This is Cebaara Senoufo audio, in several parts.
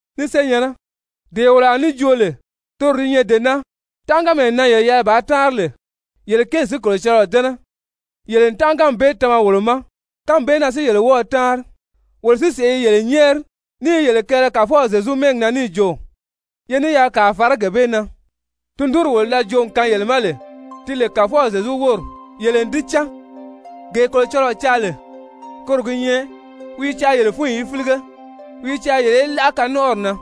Ni senyɛ̀nnɛ, dee wolo a ní joo lè toro di nyɛ dee naa, tánʔaganmee na yele yɛlɛ bàā táanri lè yele kéeli si Kolocɔlɔɔ dɛ́nɛ, yele n tánʔaganmi bee tama wolo ma. Kánmi bee na si yele wɔ́ɔ̄ táanri. Wolo si sèʔé i yele nyɛ́ɛri ní i yele kɛɛlɛ Kàfɔw Zyezu mɛ́ɛgi na níì jo, ye ní yaa kàa fàrá gee bee na. Tundunri wolo da joo n kaan yele ma lè ti lè Kàfɔw Zyezu wóri, yele n di cán. Gee Kolocɔlɔɔ caa lè, koro gi nyɛ wi i caa yele fúnyi í fílige. Wi i caa yele í láʔa kanɔnʔɔri na.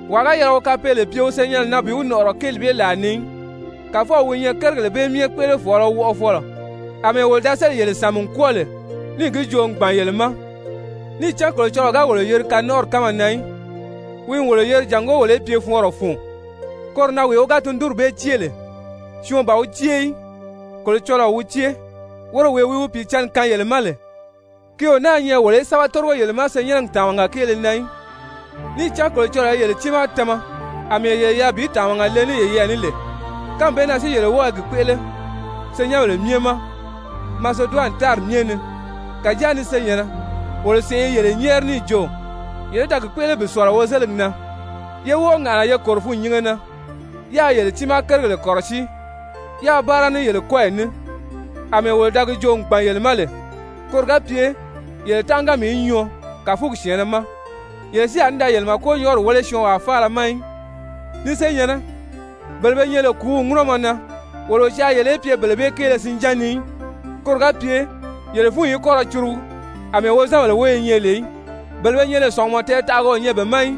Wàa ga yɛlɛ wi kapeele pye wi senyɛnnɛ na bi wi nɔ̀ʔɔrɔ kéeli bee làa ni í, Kàfɔw wi nyɛ kérigèle bee myɛ kpéʔelefɔɔlɔ wɔʔɔfɔlɔ, àmɛɛ wolo da sélì yele sàmi n kwɔ́ɔ lè, níì gi joo n gbàn yele ma. Níì cán Kolocɔlɔɔ ga wolo yeri kanɔnʔɔri kánma na í, wi n wolo yeri jàngó wolo í pye fɔɔnrɔ fun. Koro na wee wi ga tundunri bee cée lè, syɔɔn ban wi cée í, Kolocɔlɔɔ wi cée, woro wee wi wi Pìicǎnni kaan yele ma lè. Ki o náā nyɛ wolo í sɛ́bɛ tórigo yele ma senyɛnnɛgi tàmaga kéele na í, níì cán Kolocɔlɔɔ i yele tiimaa tama àmɛɛ yele yɛlɛ bi tàmaga le ní yeyɛɛ ní lè. Kánmi bee na si yele wɔ́ɔ i gi kpéʔele senyɛnbèle myɛ ma Maseduwani tári myɛ ni. Kàjáa, ni senyɛ̀nnɛ, wolo sèʔé i yele nyɛ́ɛri níì jo yele í da gi kpéʔele bi ní sɔ̀lɔ wozeligi na, yé wɔ́ɔ ŋàʔana ye kòro fûnnyinge na, yáā yele tiimaa kérigèle kɔ̀rɔsíi, yáā báara ní yele kɔ́yi ní àmɛɛ wolo da gi joo n gbàn yele ma lè. Koro ga pye yele tánʔaganmi í nyɔɔ kàfugi syɛ̀ɛnnɛ ma, yele si a ní da yele màkonyɔɔri wéle syɔɔnwaa faala ma í. Ni senyɛ̀nnɛ, bele be nyɛ lè kùúw ŋúnɔmɔ na, wolo o caa yele í pye bele bee kéele sinján ni í, koro ga pye yele fúnyi í kɔ́ ra curugu àmɛɛ wozanbèle wóyo nyɛ lè í, bele be nyɛ lè sɔ̀ngumɔ tɛɛtaʔaga o nyɛ be ma í.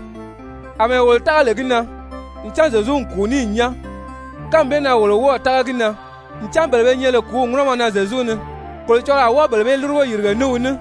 Amɛɛ wolo tága lè gi na ncan Zyezu n kùu níì nyán, kánmi bee na wolo wɔ́ɔ̀ tága gi na ncan bele be nyɛ lè kùúw ŋúnɔmɔ na Zyezu ni, Kolocɔlɔɔ a wɔ́ɔ bele bee lúrugo yìrige ní wi ní.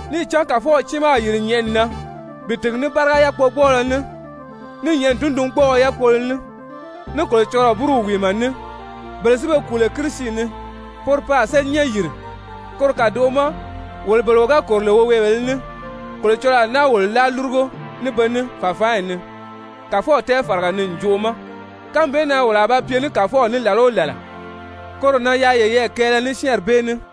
Níì cán Kàfɔw tiimaa a yìri nyɛ̀ʔɛni na bi tìgi ní báriga yákpogbɔɔlɔ ní, ní nyɛ̀ʔɛni tundungbɔɔɔ yákpolo ní, ní Kolocɔlɔɔ búruw wìimɛ ní, bele si be kùu lè Kirisi ni, poro pe a séli nyán yìri. Koro kàdoʔo ma wolo bele wo ga kòro lè woweebèlē ní, Kolocɔlɔɔ a náa wolo láa lúrugo ní be ní fàfaanyi ni Kàfɔw tɛɛfaraga ni ǹjoʔo ma, kánmi bee na wolo a ba pye ní Kàfɔw ní làla o làla. Koro na yaa yeyɛɛ kɛɛlɛ ní syɛ́ɛnri bee ní.